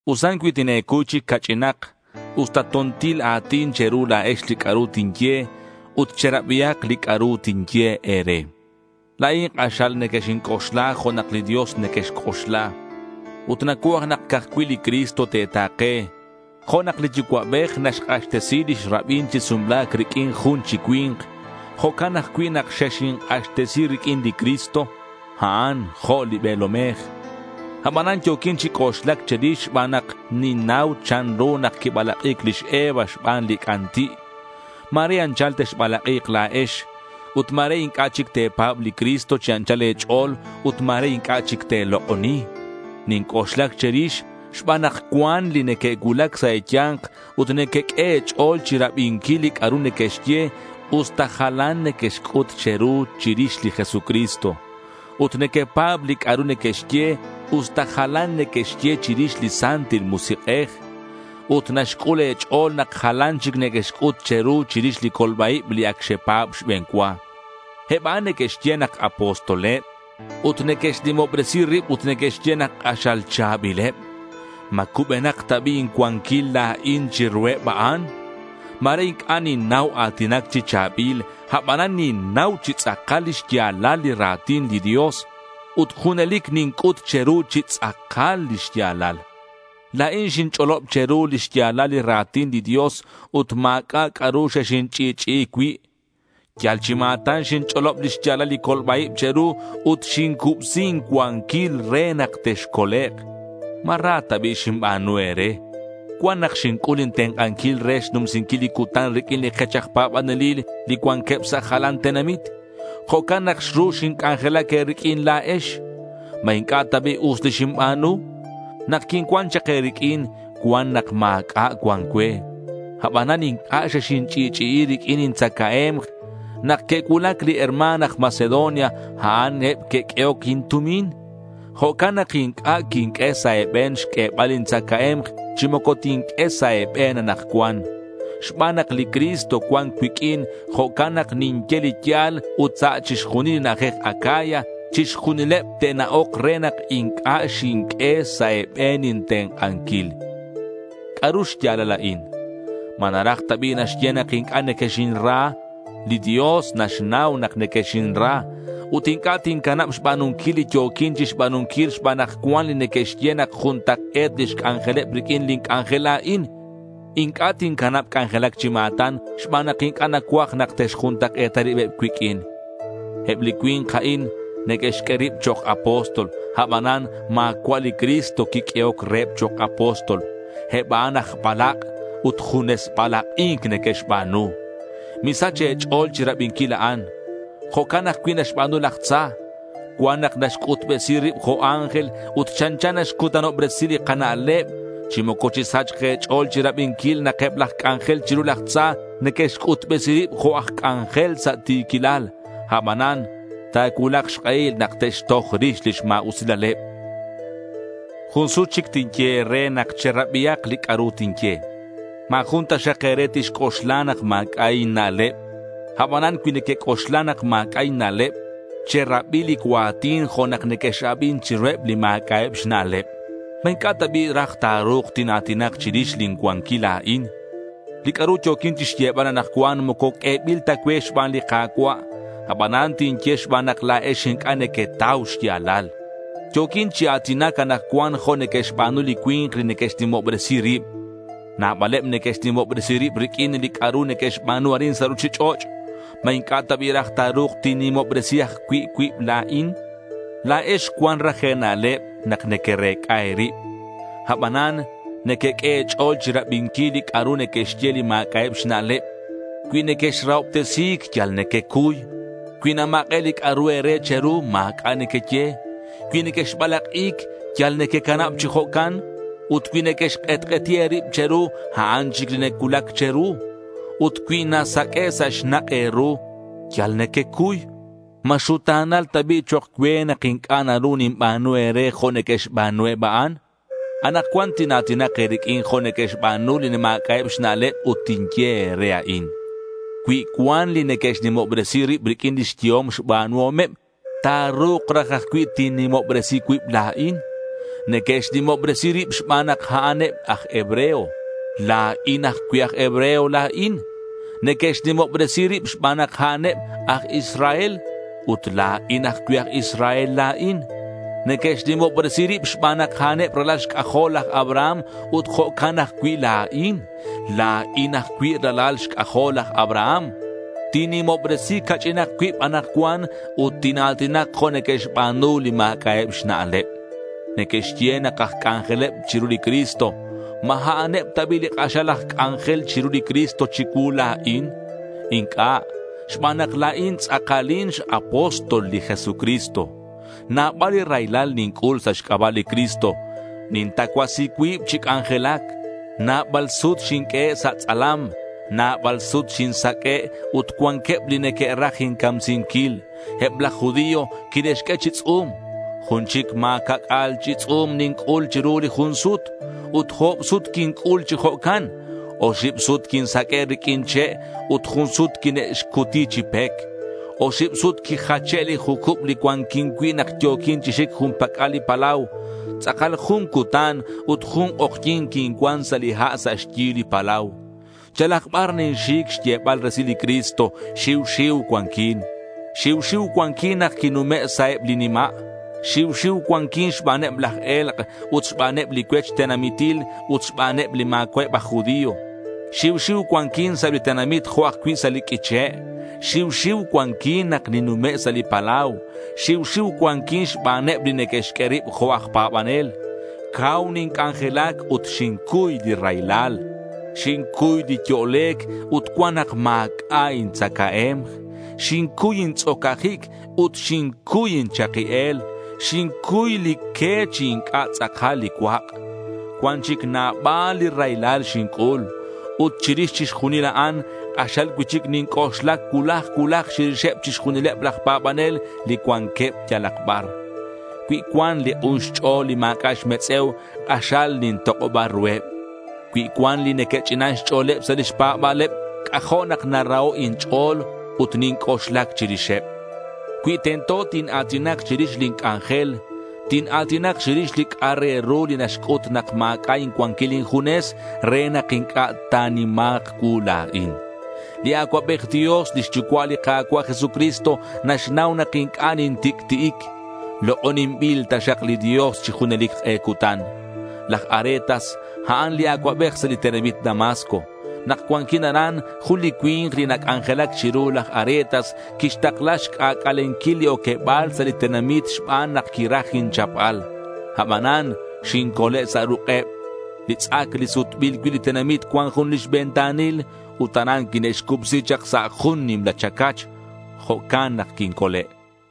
Usan cui tine̱cuy chic ca'ch'inak usta to̱ntil a̱tin che̱ru la̱ex li c'a'ru tinye ut cherabihak li c'a'ru tinye e̱re. La̱in k'axal nequexinc'oxla jo' nak li Dios nequexc'oxla. Ut nacuaj nak ca'aj cui' li Cristo te̱ta̱ke. Jo' nak li yucua'bej naxk'axtesi lix rabin chi sumla̱c riq'uin jun chi cui̱nk, jo'can ajcui' nak xexink'axtesi riq'uin li Cristo. A'an jo' li be̱lomej. Abanan yo̱quin chi c'oxlac che̱rix xban nak ninnau chanru nak quibalak'i̱c lix Eva xban li c'anti'. Ma̱re anchal texbalak'i̱k la̱ex ut ma̱re inc'a' chic te̱pa̱b li Cristo chi anchal e̱ch'o̱l ut ma̱re inc'a' chic te̱lok'oni. Ninc'oxlac che̱rix xban nak cuan li neque'cuulac sa' e̱ya̱nk ut nequeq'ue e̱ch'o̱l chirabinquil li c'a'ru neque'xye, usta jalan neque'xc'ut che̱ru chirix li Jesucristo. Ut nequepa̱b li c'a'ru neque'xye usta jalan neque'xye chirix li Santil Musik'ej. Ut naxc'ul e̱ch'o̱l nak jalan neque'xc'ut che̱ru chirix li colba-ib li ac xepa̱b xbe̱n cua. Eb a'an neque'xye nak apostoleb ut neque'xnimobresi rib ut neque'xye nak k'axal cha̱bileb. ¿Ma cubenak ta bi' incuanquil la̱in chiruheb a'an? Ma̱re inc'a' ninnau a̱tinac chi cha̱bil, abanan ninnau chi tz'akal li xya̱lal li ra̱tin li Dios. Ut junelic ninc'ut che̱ru chi tz'akal li xya̱lal. La̱in xinch'olob che̱ru li xya̱lal li ra̱tin li Dios ut ma̱c'a' c'a'ru xexinch'i'ch'i'i cui'. Yal chi ma̱tan xinch'olob li xya̱lal li colba-ib che̱ru ut xincubsi incuanquil re nak texcolek'. ¿Ma ra ta bi' xinba̱nu e̱re? Cuan nak xinc'ul intenk'anquil re xnumsinquil li cutan riq'uin li kech aj pa̱banelil li cuanqueb sa' jalan tenamit. Jo'can nak xru xinc'anjelac e̱riq'uin la̱ex. ¿Ma inc'a' ta bi' us li xinba̱nu? Nak quincuan chak e̱riq'uin, cuan nak ma̱c'a' cuan cue. Abanan inc'a' xexinch'i'ch'i'i riq'uin intzacae̱mk. Nak que'cuulac li herma̱n aj Macedonia, a'an eb que'q'uehoc intumin. Jo'can nak inc'a' quinq'ue sa' e̱be̱n xq'uebal intzacae̱mk chi moco tinq'ue sa' e̱be̱n anakcuan. Xban nak li Cristo cuan cuiq'uin, jo'can nak ninye li ya̱l ut sa' chixjunil li na'ajej Acaya, chixjunileb te'na'ok re nak inc'a' xinq'ue sa' e̱be̱n intenk'anquil. ¿C'a'ru xya̱lal a'in? ¿Ma naraj ta bi' naxye nak inc'a' nequexinra? Li Dios naxnau nak nequexinra. Ut inc'a' tincanab xba̱nunquil li yo̱quin chixba̱nunquil xban nak cuan li neque'xye nak juntak'e̱t lix c'anjeleb riq'uin lin c'anjel la̱in. Inc'a' tincanab c'anjelac chi ma̱tan xban nak inc'a' nacuaj nak te'xjuntak'e̱ta ribeb cuiq'uin. Eb li cui̱nk a'in neque'xq'ue rib chok' apóstol. Abanan ma̱cua' li Cristo quiq'uehoc reheb chok' apóstol. Eb a'an aj balak' ut junes balak'i̱nc neque'xba̱nu. Misach e̱ch'o̱l chirabinquil a'an. Jo'can ajcui' naxba̱nu laj tza. Cuan nak naxc'utbesi rib jo' ángel ut chanchan naxcutanobresi li kana'leb. Chi moco chisachk e̱ch'o̱l chirabinquil nak eb laj c'anjel chiru laj tza neque'xc'utbesi rib jo' aj c'anjel sa' ti̱quilal. Abanan ta̱cuulak xk'ehil nak te'xtoj rix lix ma̱usilaleb. Jun sut chic tinye e̱re nak cherabihak li c'a'ru tinye. Ma̱ jun taxak e̱re tixc'oxla nak ma̱c'a' inna'leb. Abanan cui nequec'oxla nak ma̱c'a' inna'leb, cherabi li cua̱tin jo' nak nequex-abin chiruheb li ma̱c'a'eb xna'leb. ¿Ma inc'a' ta bi' raj ta̱ru̱k tina̱tinak chirix lin cuanquil la̱in? Li c'a'ru yo̱quin chixyebal anakcuan moco q'uebil ta cue xban li Ka̱cua'. Abanan tinye xban nak la̱ex inc'a' nequetau xya̱lal. Yo̱quin chi a̱tinac anakcuan jo' neque'xba̱nu li cui̱nk li neque'xnimobresi rib. Nabaleb neque'xnimobresi rib riq'uin li c'a'ru neque'xba̱nu arin sa' ruchich'och'. ¿Ma inc'a' ta bi' raj ta̱ru̱k tinnimobresi ajcui' cuib la̱in? La̱ex cuan raj e̱na'leb nak nequerec'a e̱rib. Abanan nequeq'ue e̱ch'o̱l chirabinquil li c'a'ru neque'xye li ma̱c'a'eb xna'leb. Cui nequexrahobtesi̱c yal nequecuy. Cui namak'e' li c'a'ru e̱re che̱ru, ma̱c'a' nequeye. Cui nequexbalak'i̱c, yal nequecanab chi jo'can. Ut cui neque'xk'etk'eti rib che̱ru, a'an chic li nacuulac che̱ru. Ut cui nasaq'ue' sa' xnak' e̱ru, yal nequecuy. ¿Ma xuta̱nal ta bi' chok' cue nak inc'a' naru ninba̱nu e̱re jo' neque'xba̱nu eb a'an? Anakcuan tina̱tinak e̱riq'uin jo' neque'xba̱nu li ma̱c'a'eb xna'leb ut tinye e̱re a'in: Cui cuan li neque'xnimobresi rib riq'uin lix yehom xba̱nuhom, ta̱ru̱k raj ajcui' tinnimobresi cuib la̱in. Neque'xnimobresi rib xban nak a'an eb aj hebreo. La̱in ajcui' aj hebreo la̱in. Neque'xnimobresi rib xban nak a'aneb aj Israel. Ut la̱in ajcui' aj Israel la̱in. Neque'xnimobresi rib xban nak a'aneb ralal xc'ajol laj Abraham ut jo'can ajcui' la̱in. La̱in ajcui' ralal xc'ajol laj Abraham. Tinnimobresi ca'ch'inak cuib anakcuan ut tina̱tinak jo' neque'xba̱nu li ma̱c'a'eb xna'leb. Neque'xye nak aj c'anjeleb chiru li Cristo. ¿Ma a'aneb ta bi' li k'axal aj c'anjel chiru li Cristo chicuu la̱in? Inc'a', xban nak la̱in tz'akalin x-apóstol li Jesucristo. Nabal li raylal ninc'ul sa' xc'aba' li Cristo. Nintacuasi cuib chi c'anjelac. Nabal sut xinq'uehe' sa' tz'alam. Nabal sut xinsaq'ue' ut cuanqueb li neque'raj incamsinquil. Eb laj judío quine'xq'ue chi tz'u̱m. Jun chic ma̱ ca'c'a̱l chi tz'u̱m ninc'ul chiru li jun sut. Ut o̱b sut quinc'ul chi jo'can. Oxib sut quinsaq'ue' riq'uin che' ut jun sut quine'xcuti chi pec. Oxib sut quijache' li jucub li cuanquin cui' nak yo̱quin chi xic jun pac'al li palau. Tz'akal jun cutan ut jun k'ojyi̱n quincuan sa' li ha' sa' xyi li palau. Yalak bar ninxic xyebal resil li Cristo, xiu xiu cuanquin. Xiu xiu cuanquin nak ninnume' sa' eb li nima'. Xiu xiu cuanquin xbaneb laj e̱lk' ut xbaneb li cuech tenamitil ut xbaneb li ma̱cua'eb aj judío. Xiu xiu cuanquin sa' eb li tenamit jo' ajcui' sa' li q'uiche'. Xiu xiu cuanquin nak ninnume' sa' li palau. Xiu xiu cuanquin xbaneb li neque'xq'ue rib jo' aj pa̱banel. Cau ninc'anjelac ut xincuy li raylal. Xincuy li yo'lec' ut cuan nak ma̱c'a' intzacae̱mk. Xincuy intz'ocajic ut xincuy inchaki el. Xincuy li que chi inc'a' tz'akal li cuak'. Cuan chic nabal li raylal xinc'ul. Ut chirix chixjunil a'an, k'axal cui'chic ninc'oxlac cuulaj cuulaj chirixeb chixjunileb laj pa̱banel li cuanqueb yalak bar. Cui cuan li k'un xch'o̱l li ma̱c'a' xmetz'e̱u, k'axal nintok'oba ruheb. Cui cuan li neque'ch'inan xch'o̱leb sa' lix pa̱ba̱leb, c'ajo' nak naraho' inch'o̱l ut ninc'oxlac chirixeb. Cui tento tina̱tinak chirix lin c'anjel, tina̱tinak chirix li c'a' re ru li naxc'ut nak ma̱c'a' incuanquil injunes re nak inc'a' ta̱nima̱k cuu la̱in. Li Acuabej Dios, lix Yucua' li Ka̱cua' Jesucristo naxnau nak inc'a' nintic'ti'ic. Lok'oninbil taxak li Dios chi junelic k'e cutan. Laj Aretas, a'an li acuabej sa' li tenamit Damasco. Nak cuanquin aran, jun li cui̱nk li nac'anjelac chiru laj Aretas, quixtakla xc'ac'alenquil li oqueba̱l sa' li tenamit xban nak quiraj inchapbal. Abanan xincole' sa' ruk'eb. Li tz'ac li sutbil cui' li tenamit cuan jun lix ventanil. Ut aran quine'xcubsi chak sa' jun nimla chacach. Jo'can nak quincole'.